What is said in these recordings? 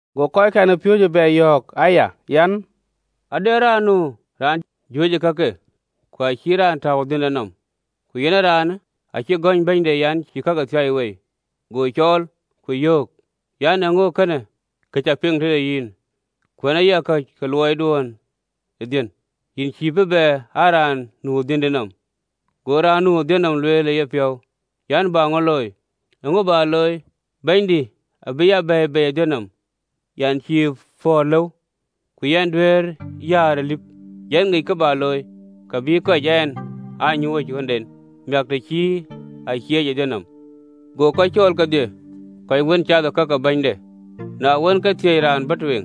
Go kɔckɛn ë piööcë bɛ yɔ̈ɔ̈k aya an, “Ade raan nu raan juëc ë kakë, ku acï raan tääu ë dhiënde nɔm, ku raanë acï gɔ̈ny bɛ̈nyde an, cï kakë thiai wei. Go cɔɔl, ku yöök an, ‘Ee käŋö ee kënë kë cä piŋ tëde yïn? Kuɛ̈në ya ka ke luɔiduön ë dhiën, yïn cïï bï bɛ aa raan nu ë dhiëndï nɔm.’ Go raan nu ë dhiën nɔm lueel ë yepiɔ̈u an, ‘Bä ŋö looi? Bɛ̈nydï abïï ya bei ë dhiën nɔm: yɛn cïï pɔ̈ɔ̈r ee lëu, ku yɛn duëër yäär ë lip. Yɛn ŋic kë bä looi, kë bï kɔc ɛn aa nyuööc ë ɣöötken, miäk, të cï a cieec ë dhiën nɔm.’ Go kɔc cɔɔl kedhie, kɔc wën cath ë ka ke bɛ̈nyde. Na wën, ke thiëc raan bɔ̈ tueŋ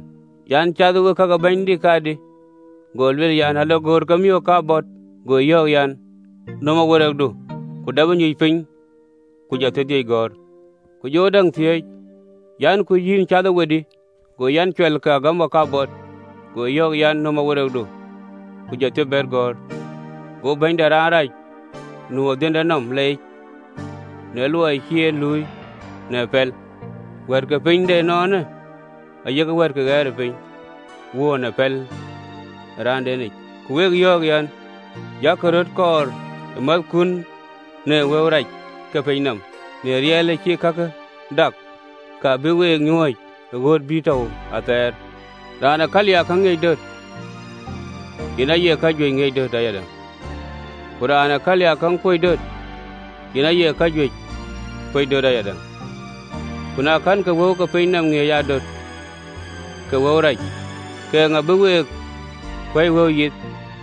an, ‘Cathë we ka ke bɛ̈nydï kadï?’ Go lueel an, ‘Alogöör ke miök kabɔt.’ Go yöök an, ‘Nöm awerekdu, ku dap nyuc piny, ku jɔ thiërdhïc gɔ̈ɔ̈r.’ Ku jɔ däŋ thiëëc an, ‘Ku yïn cathë we dï?’ Go, an, ‘Cual ke agamɔ kabɔt.’ Go yɔ̈ɔ̈k an, ‘Nöm awerekdu, ku jɔ thiërbɛ̈t gɔ̈ɔ̈r.’ Go bɛ̈nyde raan rac nu ë dhiënde nɔm leec në luɔi cï en pɛl: wɛ̈ɛ̈t ke piny de ënɔɔnë ayek wɛ̈ɛ̈t ke ɣɛɛrëpiny wöör në pɛl ë remdenic.” Ku wek yɔ̈ɔ̈k an, “Yak röt kɔ̈ɔ̈r määthkun në wëu rac ke piny nɔm, na rial, acï kakun dak, ka bïk week nyuööc ë ɣööt bï tɔ̈u athɛɛr yiic. Raan ee kaliiakäŋ ŋiëc döt, yen aye kajuëc ŋiëc döt ayadäŋ: ku raan ë kaliiakäŋ kuöc döt, yen aye kajuëc kuöc döt ayadäŋ. Ku na kɛ̈nkï wëu ke piny nɔm ŋiëc aa döt kek wëu rac, ke eeŋa bï we kuɛ̈i wëu yith?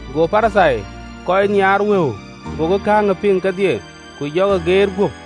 Go Parithai, kɔc nhiaar wëu, gokï kakë piŋ kedhie, ku jɔkï geet guöp.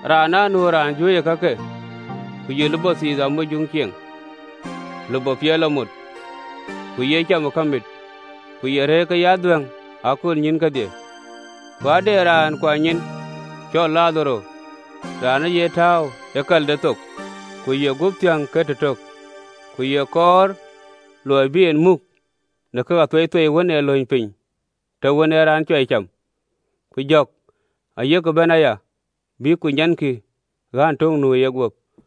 “Raan anu raan juëc ë kakë, ku ye lupɔ thiith amujuŋ cieŋ, lupɔ piɛth lɔ mot, ku ye cam ë kamit ku ye rëër ke ye adhuɛ̈ŋ ë aköölnyïïn kedhie. Ku ade raan kuany nyin cɔl Ladharo, raan ë ye tääu ë kalde thok, ku ye guöp thiäŋ ke tëtök, ku ye kɔɔr luɔi bï ye muk në kak athueithuei wën ë lööny piny të wën ee raan cuai cam: ku jɔ̈k ayek bɛ̈n aya, bïk ku nyankï ɣään tök nu ë yeguöp.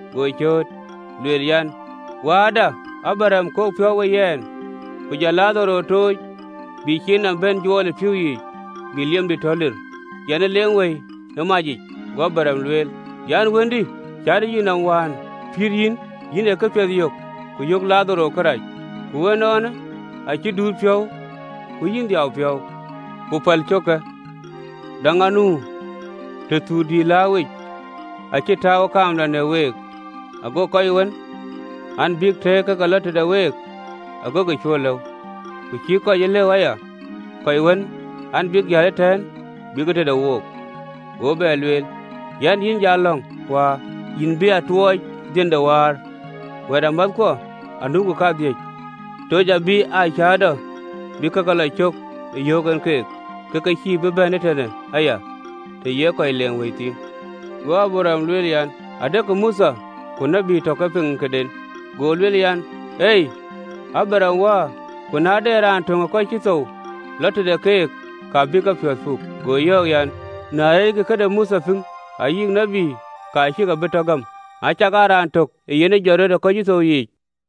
Go cööt, lueel an, “Wääda Abraɣam, kok piɔ̈u we yɛn, ku jɔ Ladharo tooc, bï ciin nɔm bɛ̈n juɔɔl ë pïïu yiic, bï liemdï tɔ lir, yɛn ë leeŋ wëi ë manyë yic. Go Abraɣam lueel an, ‘Wëndï, cätë yïnɔm, wään pïïr yïn, yïn ee këpiɛth yök, ku yök Ladharo karɛc, ku ënɔɔnë acï duut piɔ̈u, ku yïn dhiau piɔ̈u. Ku päl cöökë, däŋ nu, tëthuth dïït lääuwic acï tääu ë kaamda në week, ago kɔc wën an, bïk tëëk ke ke lɔ tëde week, agokï cuö lëu, ku cïï kɔc e lëu aya, kɔc wën an, bïk jäl ëtɛ̈ɛ̈n, bïk tëde wook.’ Go bɛ lueel an, ‘Yïn läŋ, Wäär an, bä tuɔɔc dhiën ë wäär, wɛ̈ɛ̈tamäthkuɔ anukï kadhïc, toc abï aa cäätɔ bï ke lɔ cök ë yöök en ke, ke ke cïï bï bɛ̈n ee tënë aya, të ye kɔc leeŋ wëi thïn.’ Go Abraɣam lueel an, ‘Adekï Mothe ku tït, tɔ ke piŋ këden.’ Go lueel an, ‘Ei, Abraɣam wäär: ku na de raan töŋ ë kɔc cï thou yiic lɔ tëde keek, ka bïk kepiɔ̈ɔ̈th puk.’ Go yɔ̈ɔ̈k an, ‘Na reeckï këde Mothe piŋ ayï këde tït, ka cïï ke bï tɔ gäm, acakaa raan tök yen ë jɔt ë kɔc cï thou yiic.”’